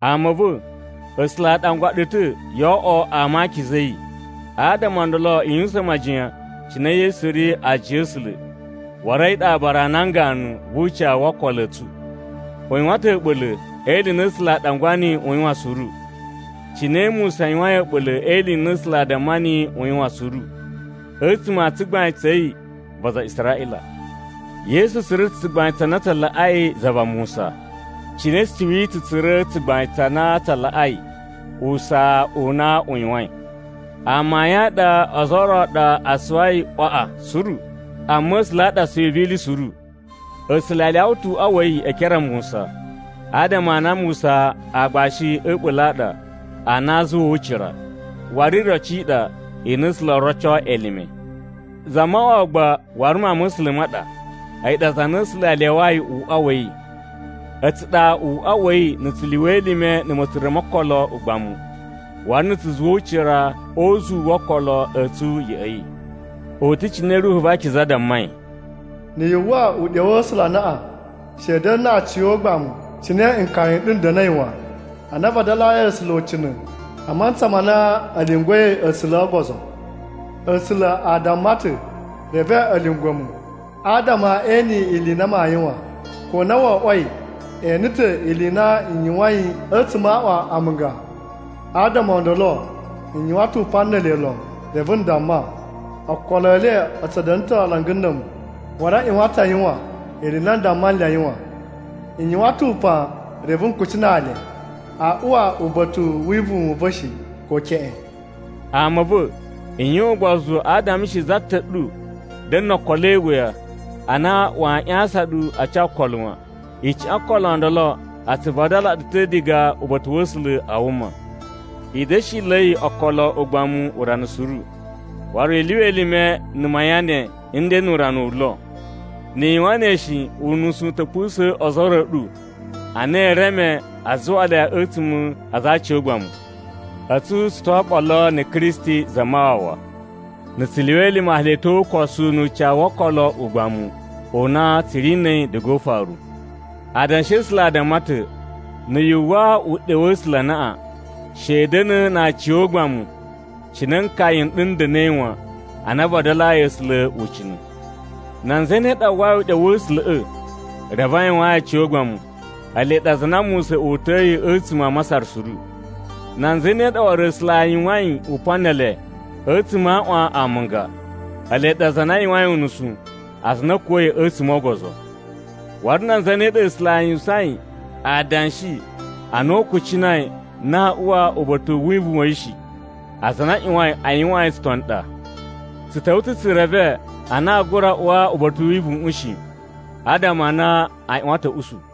Ama a̱ va̱, A̱sula̱ a ɗangwa ɗu ta̱ yo oꞌwo ama a akiza a̱ yi. Adama o ndolo i yuwusan majiyan cine Yesu ri aajiya a̱ A̱sula̱, waru a̱yi ɗa aabara a nan ganu vu ucawu wo okolo a̱ tsu. U yuwan ta̱ a̱ɓula̱ e ili i na A̱sula̱ a ɗangwa niyi u yuwan suru, cine Musa yuwain a̱ɓula̱ e ili i na A̱sula̱ a damma niyi u yuwan suru, a̱tsuma̱ a tsugbain tsa̱ yi va aza a Israꞌila. Yesu tsura̱ ta̱ tsugbain tsa na tsa laꞌai za va Musa, cine suwi tsu tsura̱ tsugbain tsa na tsa laꞌai usaa u na u yuwain. Amayun a ɗa ozo o ro ɗa a suwai ꞌwaꞌa suru, amma A̱sula̱ a ɗa suwi vi ili suru. A̱sula̱ a lyawa ta̱ uꞌwa wa̱ yi e ekere a Musa, adama a na Musa aagbashi a̱ a̱ɓula̱ a ɗa a na a zuwaa ucira, waru iroci i ɗa i na A̱sula̱ oo roco elime. Zamawawa gba waru Mawun ma̱ A̱sula̱ ma ɗa, a̱yi ɗa za na A̱sula̱ a lyawayi uꞌwa wa̱ yi. A̱tsu ɗa uꞌwa wa̱ yi na̱ tsu lyuwa elime na̱ ma̱tsura̱ mo okolo ugbamu, waru na̱ tsu zuwa ucira o uzuwu wo okolo a̱ tsu ya̱ꞌa̱ yi. U ta̱ cine Ruhu va Akiza dammai, “Na̱ yu uwwa uɗyo wa̱ A̱sula̱ anaꞌan, she i da̱na̱ na aciyogbamu cine nkaya n ɗu n da̱na̱i wan, ana a vadalayi A̱sula̱ ucina̱, a mantsa ma na a̱ lyungwa̱i A̱sula̱ o ogozo. A̱sula̱ a damma ta̱, ‘Reve a̱ lyungwa̱ mu, adama e ene ili i na maa yuwan, ko na wo oꞌwoi e ene ta̱ ili i na n yuwain a̱tsuma̱ a aꞌwan amunga. Adama o ndolo n yuwan ta̱ upan ne ele lon, reve n damma: “Okolo e le a̱ tsu da̱na̱ ta̱ alanga na̱ a̱mu. Waru a ꞌyuwan ta̱ a yuwan ili i na n damma nle a yuwan.” N yuwan ta̱ upan reve n kucinaa le, “Aa uwa uba̱ta̱ u wivuwun u va̱ shi, ko keꞌen.”’” Ama a̱ va̱, i yuwan ugbozu adama she za ta̱ ɗu da̱na̱ no okolo e iwuya, a na waa ꞌyasan ɗu a ca okolo wan. Icuꞌun yo okolo o ndolo a tsu vadala ɗu ta̱ diga uba̱ta̱ wa̱ A̱sula̱ a wuma. I da̱shila̱i okolo ugbamu urana suru. Waru i lyuwa elime na̱ mayan ne n de nu urana wu lo. Ni i yuwan ne shi, unusu u ta̱ pusa̱a̱n ozo o ro a̱ ɗu a na e reme a zuwa le a̱tsuma̱ a aza a aciyogbamu. A̱tsu tsu to oɓolo na̱ Kristi Zamawawa na̱ tsu lyuwa elime hali a̱ tyo o ukosu nu ucawu wo okolo o ugbamu u na tsu ri na̱ a̱yi diga o ufaru. Adanshi A̱sula̱ a damma ta̱, “Na̱ yu uwwa uɗyo wa̱ A̱sula̱ anaꞌan, she i da̱na̱ na aciyogbamu, cine nkaya n ɗu n da̱na̱i wan ana a vadalayi A̱sula̱ ucina̱.” Nan zane ɗa a uwwai uɗyo wa̱ A̱sula̱ꞌa̱ reve a yuwaan yi aciyogbamu? Ele ɗa aza a na Musa uta̱yi a̱tsuma̱ a Masar suru. Nan zane ɗa waru A̱sula̱ a yuwain upan ne ele a̱tsuma̱ a aꞌwan amunga? Ele ɗa aza a na a yuwain unusu, aza a na a̱ kuwa̱i a̱tsuma̱ o ogozo. Waru nan zane ɗa A̱sula̱ a yuwusain adanshi ana u kucinai na aa uwa uba̱ta̱ u wivuwun wa̱ yi shi? Aza a na a ꞌyuwain a yuwaan yi tsutoni ɗa. Tsu ta̱wa̱ ta̱ tsu reve a na aa gura uwa uba̱ta̱ u wivuwuꞌun shi, adama a na a ꞌyuwan ta̱ a̱ usu.